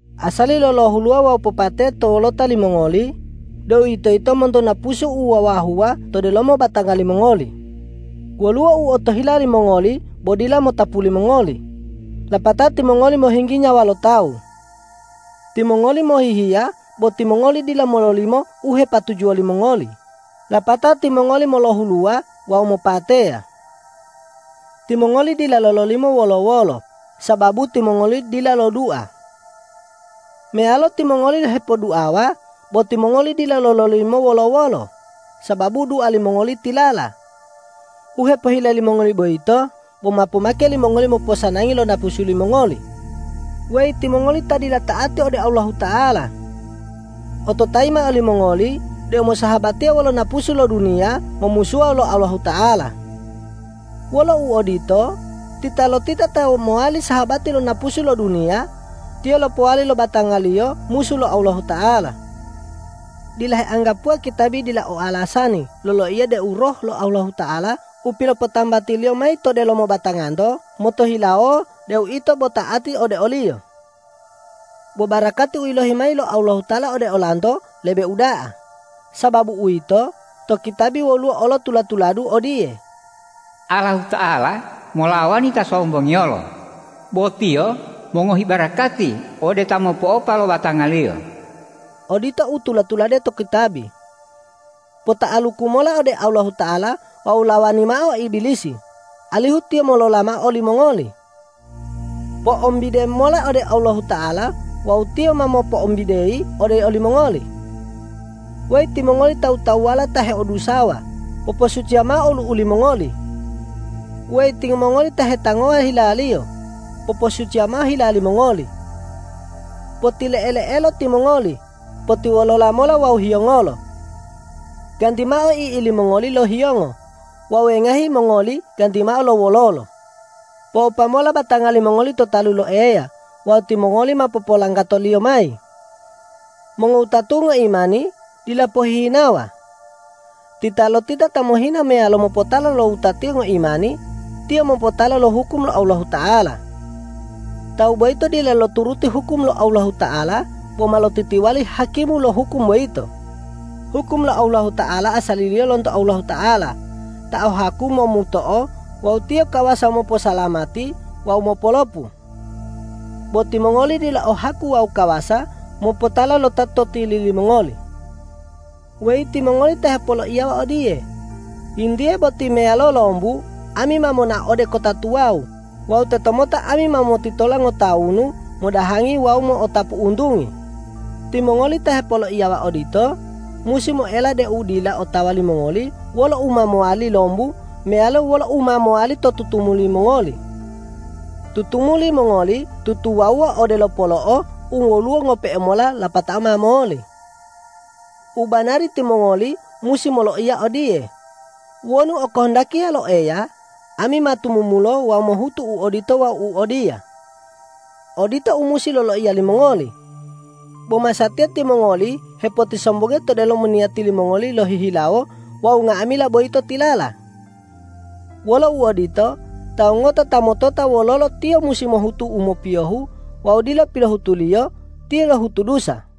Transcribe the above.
Asali lo lohuluwa wawu popateya to wolota limongoli, deuwitoyito monto napusu u wawahuwa to delomo batanga limongoli. Woluwo u otohila limongoli bo dila motapu limongoli, lapatao timongoli mohinggi nyawa lo tawu. Timongoli mohihiya bo timongoli dila mololimo u hepatujuwo limongoli, lapatao timongoli molohuluwa wawu mopateya. Timongoli dila lololimo wolo-wolo, sababu timongoli dila lodua. Meyalo timongoli hepoduawa bo timongoli dila lololimo wolo-wolo, sababu dua limongoli tilala. U hepohile limongoli boyito bo ma pomake limongoli moposanangi lo napusu limongoli. Weyi timongoli ta dila ta'ati ode Allahuta'ala! Ototayi mao limongoli deu mosahabatiya wolo napusu lo duniya momusuwa wolo Allahuta'ala. Wolo uodito, titalotita ta mowali sahabati lo napusu lo duniya, tiyo lopowali lo batangaliyo musu lo Allahuta'ala. Dila heanggapuwa kitabi dila o alasani loloiya deu Roh lo Allahuta'ala u pilopotambati-Liyo mayi to delomo batanganto motohilawo deu ito bo ta'ati ode o-Liyo. Bo barakati u yilohi mayi lo Allahuta'ala ode olanto lebe uda'a. Sababu uwito, to kitabi woluwo olo tula-tuladu odiye,”Allahuta'ala molawani ta sombongiyolo, bo Tiyo mongohi barakati ode ta mopo'opa lo batangaliyo.” Odito u tula-tulade to kitabi. Pota'aluku mola ode Allahuta'ala wawu lawani mao Ibilisi, alihu tiyo molola mao olimongoli. Po'ombide mola ode Allahuta'ala wawu Tiyo ma mopoembideyi ode olimongoli. Weyi timongoli tawu-tawuwala ta heodusawa, poposuciya mao olu'u limongoli! Weyi timongoli ta hetangowa hilaliyo, poposuciya mao hila limongoli! Potile'ele'elo timongoli, potiwolola mola wawu hiyongolo. Ganti mao i'i limongoli lo hiyongo wawu wengahi mongoli ganti mao lo wololo. Po'opa mola batanga limongoli to talu lo Eya wawu timongoli ma popolanggato-Liyo mayi. Mongowutatu'u ngoimani, dila pohihinawa. Titalotita ta mohina meyalo mopotala lo wutatiyo ngoimani, tiyo mopotala lo hukum lo Allahuta'ala. Tawu boyito dila loturuti hukum lo Allahuta'ala bo ma lotitiwali hakimu lo hukum boyito. Hukum lo Allahuta'ala asaliliyo lonto Allahuta'ala ta o haku momuto'o wawu Tiyo kawasa moposalamati wawu mopolopu. Bo timongoli dila o haku wawu kawasa mopotala lo ta to tili limongoli. Weyi timongoli ta hepoloiyawa odiye,”Yintiye boti meyalo lombu ami ma monao ode kota tuwawu wawu tetomota ami ma motitola ngotawunu modahangi wawu mo'otapu untungi.” Timongoli ta hepoloiyawa odito musi moela deu dila otawa limongoli wolo u ma mowali lombu meyalo wolo u ma mowali to tutumuli mongoli. Tutumuli mongoli tutuwawuwa odelo polo'o u woluwo ngope'e mola lapatao ma moli. U banari timongoli musi moloiya odiye,”Wonu okohondakiya lo Eya, ami ma tumumulo wawu mohutu u odito wawu u odiya.” Odito u musi loiya limongoli. Bo masatiya timongoli hepotisombongiya to delomo niyati limongoli lohihilawo wawu nga'amila boyito tilala. Wolo uodito, tawu ngota ta motota wololo tiyo musi mohutu u mopiyohu wawu dila pilohutuliyo, tiyo lohutu dusa.